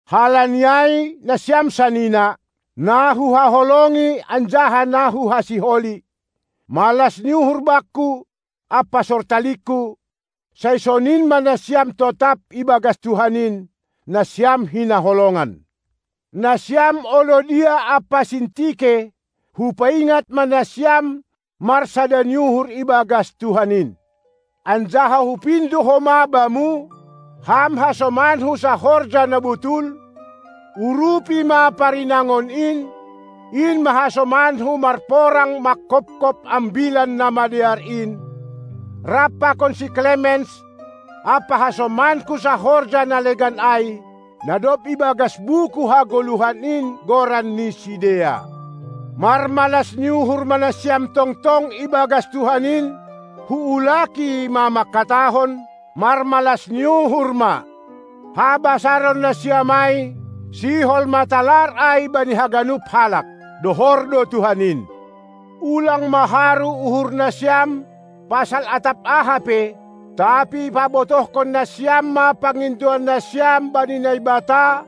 Halani ai, nasiam sanina, na huhaholongi anjaha na huhasiholi, malas ni uhur bakku ampa sortalingku, sai sonin ma nasiam totap ibagas Tuhan in, nasiam hinaholongan. Nasiam Oiodia ampa Sintike, hupaingat ma nasiam marsada ni uhur ibagas Tuhan in. Anjaha hupindo homa bamu, ham hasomanku sahorja na botul, urupi ma parinangon in, in ma hasomanku marporang manghophop Ambilan Namadear in, rap pakon si Klemens ampa hasomanku sahorja na legan ai, na dob ibagas buku hagoluhan in goran ni sidea. Marmalas ni uhur ma nasiam tongtong ibagas Tuhan in; huulaki ma mangkatahon: Marmalas ni uhur ma! Habasaron nasiam ai, sihol ma talar ai bani haganup halak! Dohor do Tuhan in. Ulang ma haru uhur nasiam pasal atap aha pe, tapi pabotohkon nasiam ma pangindoan nasiam bani Naibata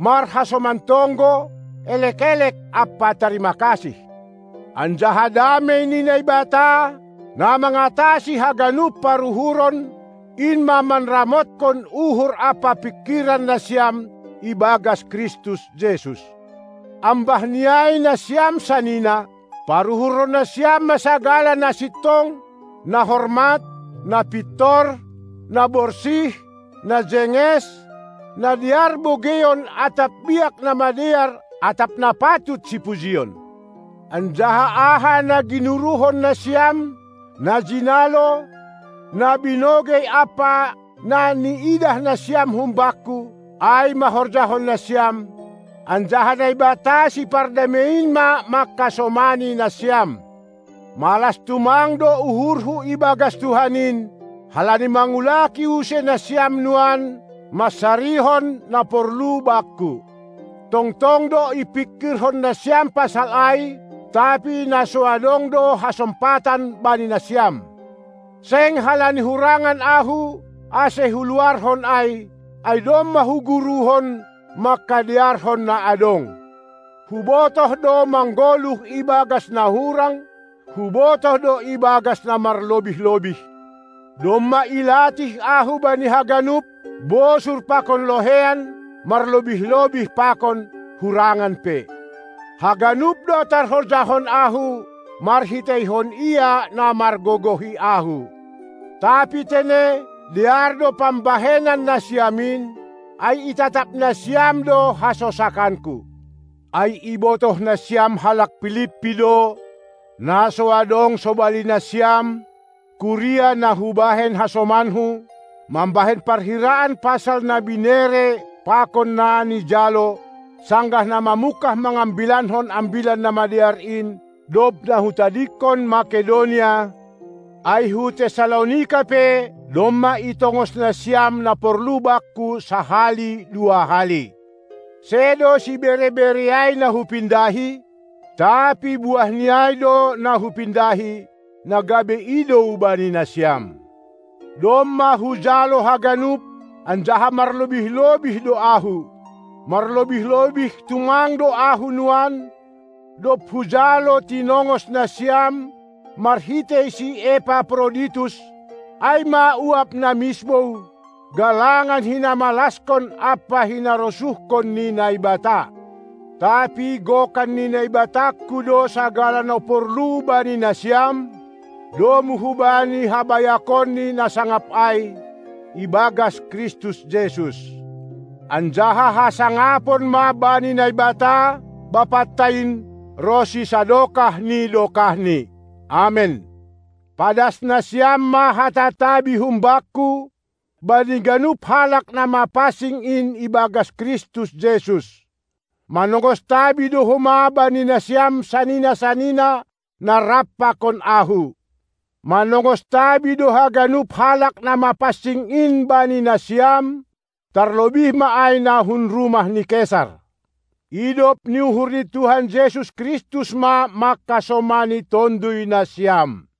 marhasoman tonggo, elek-elek ampa tarima kasih. Anjaha damei ni Naibata, na mangatasi haganup paruhuron, in ma manramothon uhur ampa pingkiran nasiam ibagas Kristus Jesus! Ambahni ai, nasiam sanina, paruhurhon nasiam ma sagala na sintong, na hormat, na pintor, na borsih, na jenges, na dear bogeion atap biak na madear atap na patut sipujion. Anjaha aha na ginuruhon nasiam, na jinalo, na binogei ampa na niidah nasiam humbakku, ai ma horjahon nasiam; anjaha Naibata Sipardamei in ma mangkasomani nasiam. Malas tumang do uhurhu ibagas Tuhan in, halani mangulaki use nasiam nuan mansarihon na porlu bakku. Tongtong do ipingkirhon nasiam pasal ai, tapi na so adong do hasompatan bani nasiam. Seng halani hurangan ahu, ase huluarhon ai, ai domma huguruhon, mangkadearhon na adong. Hubotoh do manggoluh ibagas na hurang, hubotoh do ibagas na marlobih-lobih; domma ilatih ahu bani haganup, bosur pakon loheian, marlobih-lobih pakon hurangan pe. Haganup do tarhorjahon ahu marhiteihon Ia, na margogohi ahu. Tapi tene, dear do pambahenan nasiam in, ai itatap nasiam do hasosakanku. Ai ibotoh nasiam halak Pilippi do, na so adong, sobali nasiam, kuria na hubahen hasomanku, mambahen parhiraan pasal na binere pakon na nijalo, sanggah na mamungkah mangambilankon Ambilan Namadear in, dob na hutadingkon Makedonia; ai hu Tessalonika pe domma itongos nasiam na porlu bakku sahali dua hali. Sedo sibere-bere ai na hupindahi; tapi buahni ai do na hupindahi, na gabe idou bani nasiam. Domma hujalo haganup, anjaha marlobih-lobih do ahu. Marlobih-lobih tumang do ahu nuan, dob hujalo tinongos nasiam marhitei si Epaproditus, ai ma uap na misbou, galangan na hinamalaskon ampa hinarosuhkon ni Naibata. Tapi gokan ni Naibatangku do sagala na porlu bani nasiam, domu hubani habayakonNi na sangap ai, ibagas Kristus Jesus! Anjaha hasangapon ma bani Naibata, Bapanta in, ronsi sadokah ni dokahni. Amen. Padas nasiam ma hata tabi humbakku bani ganup halak na mapansing in ibagas Kristus Jesus! Manongos tabi do homa bani nasiam sanina-sanina, na rap pakon ahu. Manongos tabi do haganup halak na mapansing in bani nasiam, tarlobih ma ai na hun rumah ni Kesar. Idop ni uhur ni Tuhan Jesus Kristus ma mangkasomani tonduy nasiam.